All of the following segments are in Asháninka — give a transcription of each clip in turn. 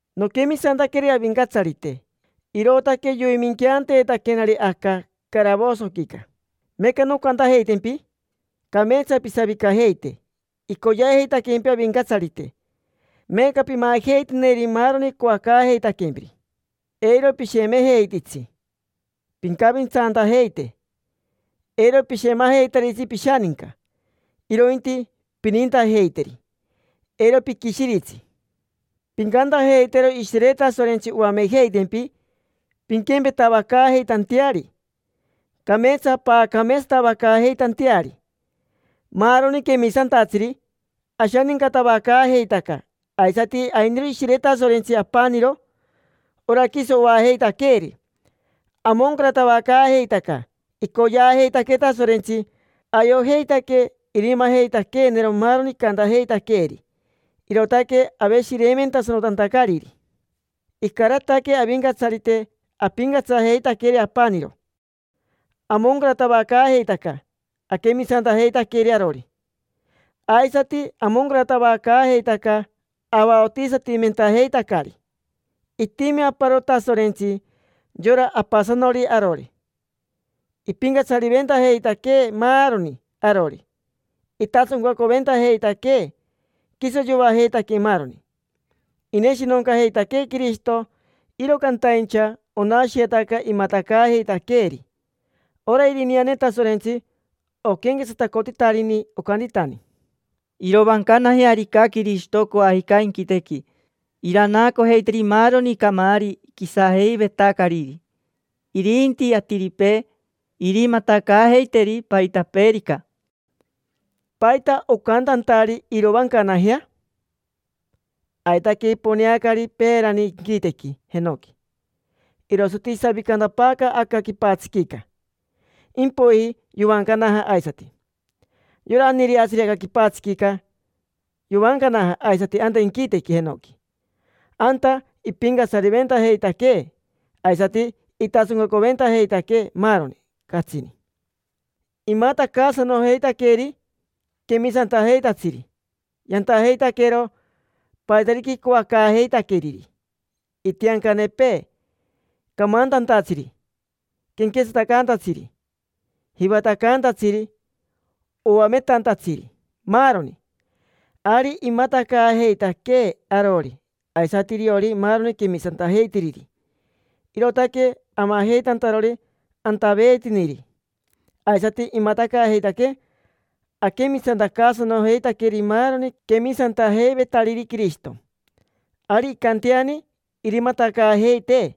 Noquemisantaqueri Avincatsarite, irootaque yoiminqueanteetaquenari aca caravosoquica. Meeca noncantajeitempi: cameetsa pisavicajeite; icoyeajeitaquempi Avincatsarite, meeca pimajeiteneri maaroni icoacaajeitaquempiri. Eiro pishemejeititsi, pincavintsantajeite, eiro pishemajeitaritsi pishaninca, irointi pinintajeiteri, eiro piquishiritsi. Pincantajeitero Ishire Tasorentsi oamejeitempi pinquempetavacaajeitanteari, cameetsa paacameetsatavacaajeitanteari. Maaroni quemisantatsiri ashanincatavacaajeitaca, aisati ainiro Ishire Tasorentsi apaniro, ora quiso oajeitaqueeri. Amoncaratavacaajeitaca: icoyeajeitaquee Tasorentsi, ayojeitaque irimajeitaqueenero maaroni icantajeitaqueeri, irootaque aveshireimentasanotantacariri. Icarataque Avincatsarite apincatsajeitaqueri apaniro, amoncaratavacaajeitaca aquemisantajeitaqueri arori, aisati amoncaratavacaajeitaca avaotisatimentajeitacari. Itimi aparo Tasorentsi: yora Apasanori arori. Ipincatsariventajeitaquee maaroni arori, itasoncaventajeitaquee, quiso yoajeitaquee maaroni. Ineshinoncaajeitaquee Quirishito, iro cantaincha onashiyetaca imatacaajeitaqueeri. Ora irineane Tasorentsi oquenquetsatacotitarini, ocantitani: “Irovancanajearica Quirishito coajica inquitequi, iranaacojeiteri maaroni camaari quisajeivetacariri; irinti atiripee, irimatacaajeiteri paitapeerica”. ¿Paita ocantantari: “Irovancanajea”? Aitaque iponeanacari peerani inquitequi jenoqui, irosati isavicantapaacari aca quipatsiquica. Impoiji yovancanaja aisati. Yora aniireatsiri aca quipatsiquica yovancanaja aisati anta inquitequi jenoqui. Anta ipincatsariventajeitaquee aisati itasoncaventajeitaquee maaroni, catsini. Imatacaasanojeitaqueri quemisantajeitatsiri yantajeitaquero paitarica icoacaajeitaqueriri: itiancanepee, camantantatsiri, quenquetsatacaantatsiri, jivatacaantatsiri, oametantatsiri, maaroni. Ari imatacaajeitaquee arori, aisati iriori maaroni quemisantajeitiriri, irootaque amajeitantarori antaveetiniri. Aisati imatacaajeitaquee aquemisantacaasanojeitaqueri maaroni quemisantajeivetariri Quirishito. Ari incanteani irimatacaajeitee,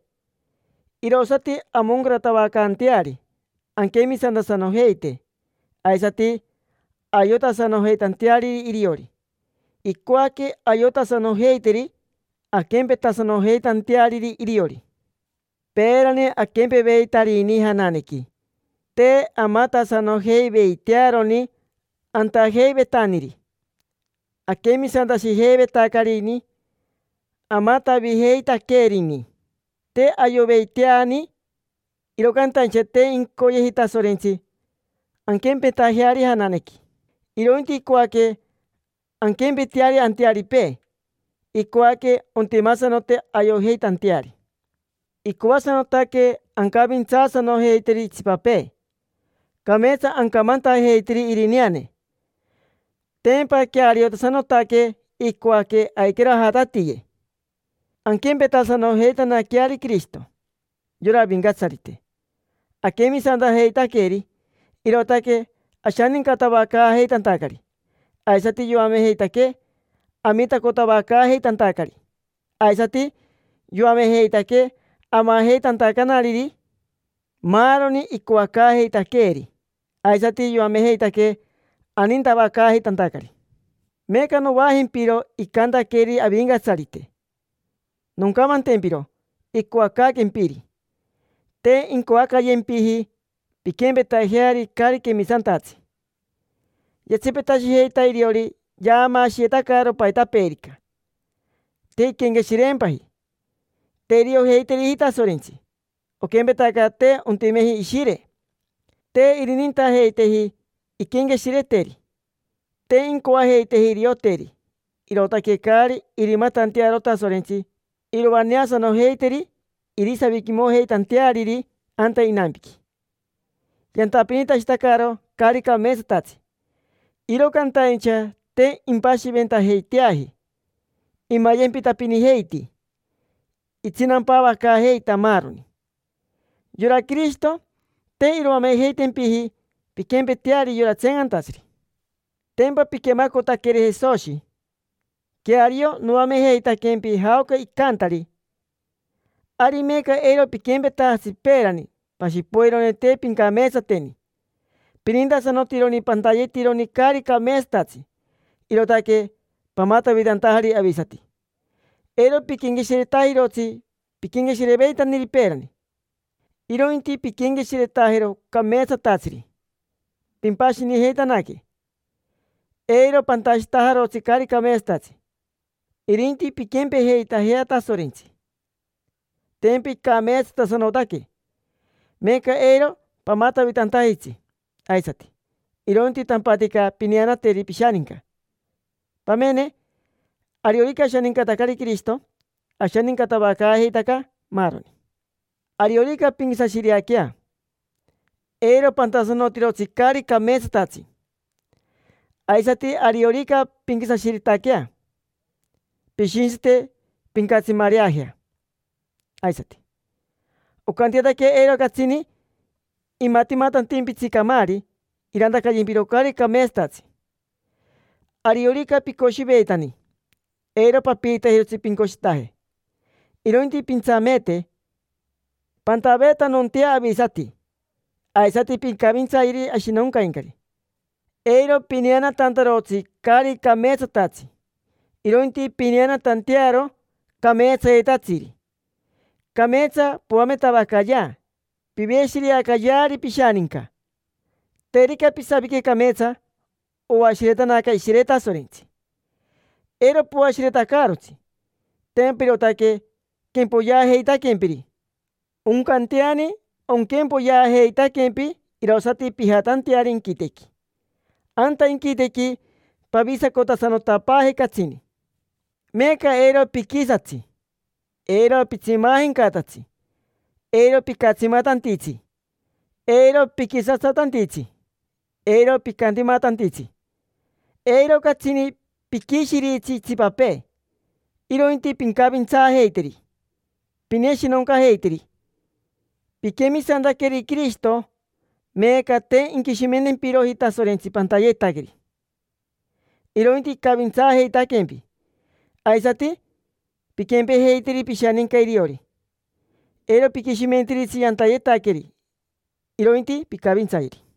irosati amoncaratavacanteari anquemisantasanojeite, aisati ayotasanojeitanteariri iriori. Icoaque ayotasanojeiteri anquempetasanojeitanteariri iriori. Peerani aquempeveitarini jananequi, te amatasanojeiveitearoni antajeivetaniri. Aquemisantashijeivetacarini amatavijeitaqueerini, te ayoveiteani. Iro cantaincha te incoyeji Tasorentsi anquempetajeari jananequi, irointi icoaque anquempeteari antearipee, icoaque ontimasanote ayojeitanteari. Icoasanotaque ancavintsaasanojeiteri itsipapee, cameetsa ancamantajeiteri irineane: tempa queariotasanotaque. Icoaque aiquero ajatatiye anquempetasanojeitanaqueari Quirishito: yora Avincatsarite. Aquemisantajeitaqueri, irootaque ashanincatavacaajeitantacari; aisati yoamejeitaquee amitacotavacaajeitantacari, aisati yoamejeitaquee amajeitantacanariri maaroni icoacaajeitaqueeri. Aisati yoamejeitaquee anintavacaajeitantacari. Meeca novaajempiro icantaqueri Avincatsarite, noncamantempiro icoacaaquempiri. Te incoacayempiji pinquempetajeari caari quemisantatsi: yatsipetashijeita iriori yaamaashiyetacaro paitapeerica, te inquenqueshireempaji. Te iriojeiteriji Tasorentsi, oquempetaca te ontimeji ishire. Te irinintajeiteji inquenqueshireteri, te incoajeiteji irioteri, irootaque caari irimatantearo Tasorentsi iroaneasanojeiteri irisaviquimojeitanteariri anta inampiqui. Yantapinitashitacaro caari cameetsatsi, iro cantaincha te impashiventajeiteaji. Imayempitapinijeiti, itsinampavacaajeita, maaroni. Yora Quirishito, te iroamejeitempiji pinquempeteari yora tseencantatsiri. Tempa piquemacotaqueri Jesoshi, queario noamejeitaquempi jaoca icantari. Ari meeca eiro piquempetajatsi peerani. Pashi poironi te pincameetsateni. Pinintasanotironi pantayetironi caari cameetsatatsi, irootaque pamatavitantajari avisati. Eiro piquenqueshiretajirotsi piquenqueshireveitaniri peerani, irointi pinquenqueshiretajero cameetsatatsiri. Pimpashinijeitanaque: eiro pantashitajarotsi caari cameetsatatsi, irinti pinquempejeitajea Tasorentsi, tempa icameetsatasanotaque. Meeca eiro pamatavitantajitsi aisati, irointi tampatica pineanateri pishaninca. Pamene: ariorica ashanincatacari Quirishito, ashanincatavacaajeitaca, maaroni. Ariorica pinquisashireaquea, eiro pantasanotirotsi caari cameetsatatsi. Aisati, ariorica pinquisashiretaquea, pishintsite pincatsimareajea aisati, oncanteataquea eiro catsini imatimatantimpitsi camaari irantacayempiro caari cameetsatatsi. Ariorica picoshiveitani, eiro papiitajirotsi pincoshitaje, irointi pintsameete. Pantaveetanontea avisati, aisati pincavintsayeri ashinoncaincari. Eiro pineanatantarotsi caari cameetsatatsi, irointi pineanatantearo cameetsayetatsiri. Cameetsa poametavacayea, piveshireacayeari pishaninca. Terica pisavique cameetsa, oashiretanaca Ishire Tasorentsi. Eiro poashiretacaarotsi: tempa irootaque quempoyeajeitaquempiri. Oncanteani onquempoyeajeitaquempi irosati pijatanteari inquitequi. Anta inquitequi pavisacotasanotapaaje catsini. Meeca eiro piquisatsi, eiro pitsimaajencatatsi, eiro picatsimatantitsi, eiro piquisatsatantitsi, eiro picantimatantitsi. Eiro catsini piquishiritsi itsipapee, irointi pincavintsaajeiteri, pineshinoncajeiteri. Piquemisantaqueri Quirishito, meeca te inquishimentempiroji Tasorentsi pantayetaqueri, irointi icavintsaajeitaquempi: aisati pinquempejeiteri pishaninca iriori, eiro piquishimentiritsi yantayetaqueri, irointi pincavintsayeri.